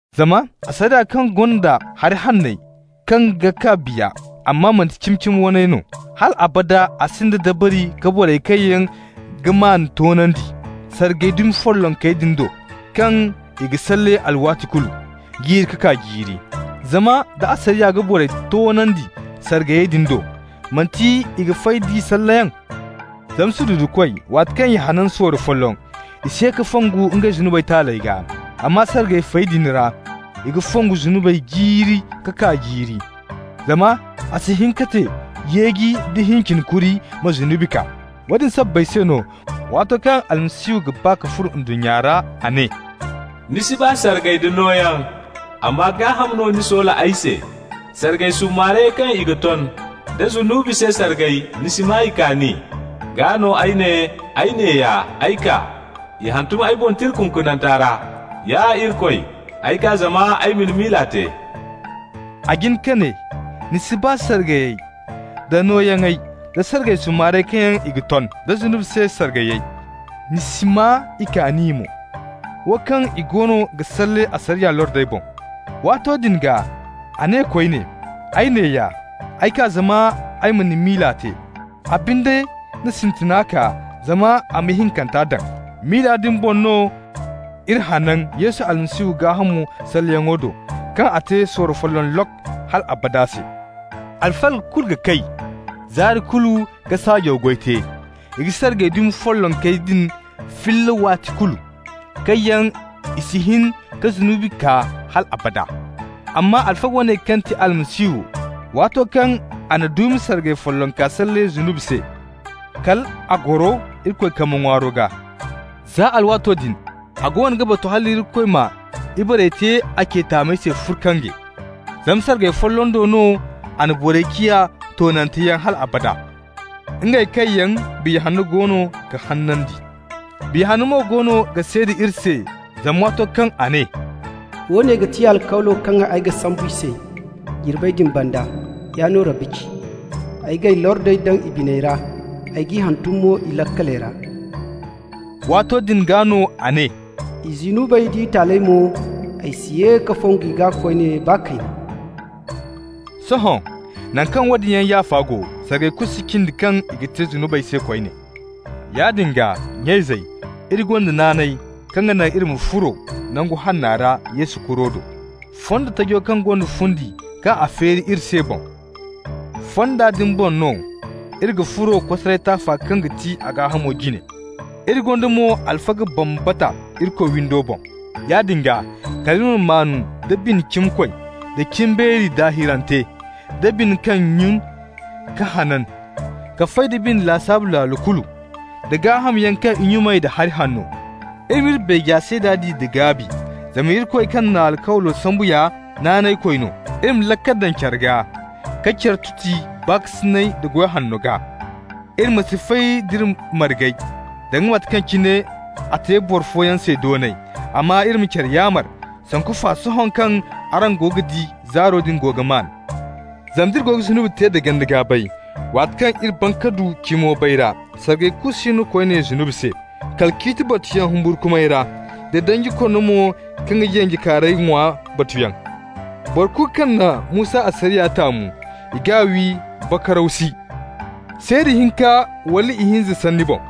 Zama asariya kaŋ gonda hari hanney kaŋ ga kaa biya, amma manti cimi-cimi waney no, hal abada a sinda dabari ka borey kaŋ yaŋ ga maan toonandi, sargay dumi follonkey din do kaŋ i ga salle alwaati kulu, jiiri ka kaa jiiri. Zama nda asariya ga borey toonandi sargayey din do, manti i ga fay d'i salleyaŋ? Zama sududukoy, waati kaŋ i hanan sorro folloŋ, i si ye ka fongu ngey zunubey taaley gaa. Amma sargay fey din ra i ga fongu zunubey jiiri ka kaa jiiri. Zama a si hin ka te yeeji nda hincin kuri ma zunubi kaa. Woodin sabbay se no, waato kaŋ Almasihu ga ba ka furo ndunnya ra a ne: «Ni si ba sargay da nooyaŋ, amma gaaham no ni soola ay se. Sargay summaare kaŋ i ga ton da zunubi se sargay, ni si maa i kaani. Gaa no ay ne: ‹Ay neeya, ay kaa. (I hantum ay boŋ tira kunkunante ra.) Ya Irikoy, ay kaa zama ay ma ni miila te.›» A jin ka ne: «ni si ba sargayey da nooyaŋey da sargay summaarey kaŋ yaŋ i ga ton, da zunubi se sargayey, ni si maa i kaani mo» (wo kaŋ i goono ga salle asariya lordey boŋ). Waato din gaa a ne koyne: «Ay neeya, ay kaa zama ay ma ni miila te.» A binde na sintina kaa zama a ma ihinkanta daŋ. Miila din boŋ no iri hanan Yesu Almasihu gaahamo salleyaŋo do, kaŋ a te sorro folloŋ lok! hal abada se. Alfaga kulu ga kay zaari kulu ka saajaw goy te. I ga sargay dumi follonkey din filla waati kulu, kaŋ yaŋ si hin ka zunubi kaa hal abada. Amma alfaga woone kaŋ ti Almasihu, waato kaŋ a na duumi sargay follonka salle zunubey se, kal a goro Irikoy kambe ŋwaaro gaa. Za alwaato din a goono ga batu hal Irikoy m'a ibarey te a ce taamey se furkange. Zama sargay folloŋ do no a na borey ciya toonanteyaŋ hal abada, ngey kaŋ yaŋ Biya Hanno goono ga hanandi. Biya Hanna mo goono ga seeda iri se, zama waato kaŋ a ne: «Woone ga ti alkawlo kaŋ ay ga sambu i se jirbey din banda, yaa no Rabbi ci: Ay g'ay lordey daŋ i biney ra, ay g'i hantum mo i laakaley ra.» Waato din gaa no a ne: «I zunubey d'i taaley mo, ay si ye ka fongu i gaa koyne baa kayna!» Sohõ, naŋ kaŋ woodin yaŋ yaafa go, sargay kulu si cindi kaŋ i ga te zunubey se koyne. Yaadin gaa, nya-izey, iri gonda naanay kaŋ ga naŋ iri ma furo Nangu Hanna ra Yesu kuro do, fondo tajo kaŋ gonda fundi kaŋ a feeri iri se boŋ. Fonda din boŋ no iri ga furo kosaray taafa kaŋ ga ti a gaahamo jine. Iri gonda mo alfaga bambata Irikoy windo boŋ. Yaadin gaa, kal iri ma maan nda bine cimikoy, da cimbeeri daahirante, da bine kaŋ nyun ka hanan ka fay da bine lasaabu laalo kulu, da gaahamyaŋ kaŋ i nyumay da hari hanno. Iri ma iri beeja seeda di da gaabi, zama Irikoy kaŋ na alkawlo sambu ya naanaykoy no. Iri ma laakal daŋ care gaa ka care tuti baakasinay da goy hanno gaa. Iri ma si fay d'iri margey, danga mate kaŋ cine a te boro fooyaŋ se doonay. Amma iri ma care yaamar, sanku fa sohõ kaŋ araŋ go ga di zaaro din go ga maan. Zama nd'iri go ga zunubi te da ganda-gaabay, waati kaŋ iri ban ka du cimo bayra, sargay kulu si no koyne zunubi se, kala ciiti batuyaŋ humburkumay ra da danji konno mo kaŋ ga yanjekaarey ŋwa batuyaŋ. Boro kulu kaŋ na Musa asariya taamu, i g'a wi bakaraw si, seeda hinka wala ihinza sanni boŋ.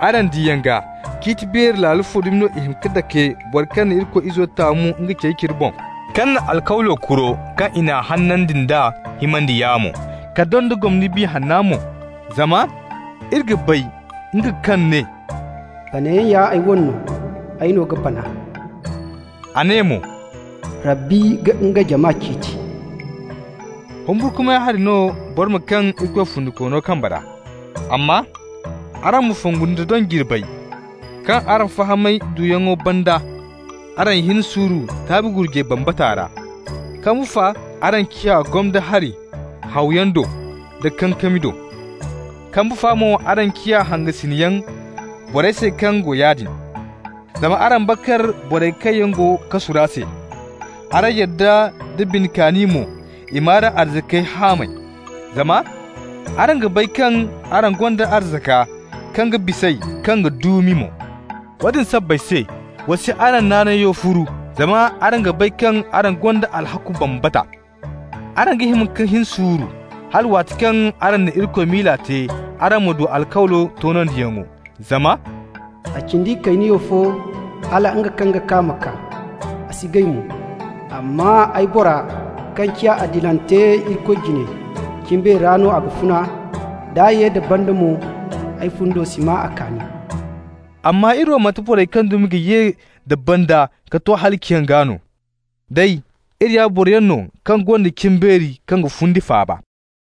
Araŋ diyaŋ gaa, ciiti beeri laalo fo dumi no i ga hima ka dake boro kaŋ na Irikoy Izo taamu nga cey cire boŋ, kaŋ na alkawlo kuro kaŋ i n'a hanandi nd'a himandi yaamo, ka donda gomni Biya Hanna mo? Zama iri g'a bay, nga kaŋ ne: «Banayaŋ ya ay wane no. Ay no ga bana.» A ne mo: «Rabbi ga nga jama ciiti.» Humburkumay hari no boro ma kaŋ Irikoy Fundikoono kambe ra. Amma araŋ ma fongu nda doŋ jirbey, kaŋ araŋ fahamay duyaŋo banda araŋ hin suuru taabi gurjay bambata ra. Kambu fa araŋ ciya gomdo hari hawayaŋ do da kankami do. Kambu fa mo araŋ ciya hangasinyaŋ borey se kaŋ go yaadin. Zama araŋ bakar borey kaŋ yaŋ go kasu ra se. Araŋ yadda nda bine kaani mo i m'araŋ arzakey hamay, zama araŋ ga bay kaŋ araŋ gonda arzaka kaŋ ga bis'ey kaŋ ga duumi mo. Woodin sabbay se, wa si araŋ naanayo furu, zama araŋ ga bay kaŋ a gonda alhakku bambata. Araŋ ga hima ka hin suuru, hala waati kaŋ araŋ na Irikoy miila te araŋ ma du alkawlo toonandiyaŋo. Zama -- «A cindi kayniyaw fo hala nga kaŋ ga kaa ma kaa, a si gay mo. Amma ay bora, kaŋ ciya adilante Irikoy jine, cimbeeri ra no a ga funa. D'a ye da banda mo, ay fundo si maa a kaani.» Amma iri wo manti borey kaŋ dumi ga ye da banda ka to halaciyaŋ gaa no. Day iri ya boroyaŋ no kaŋ gonda cimbeeri kaŋ ga fundi faaba.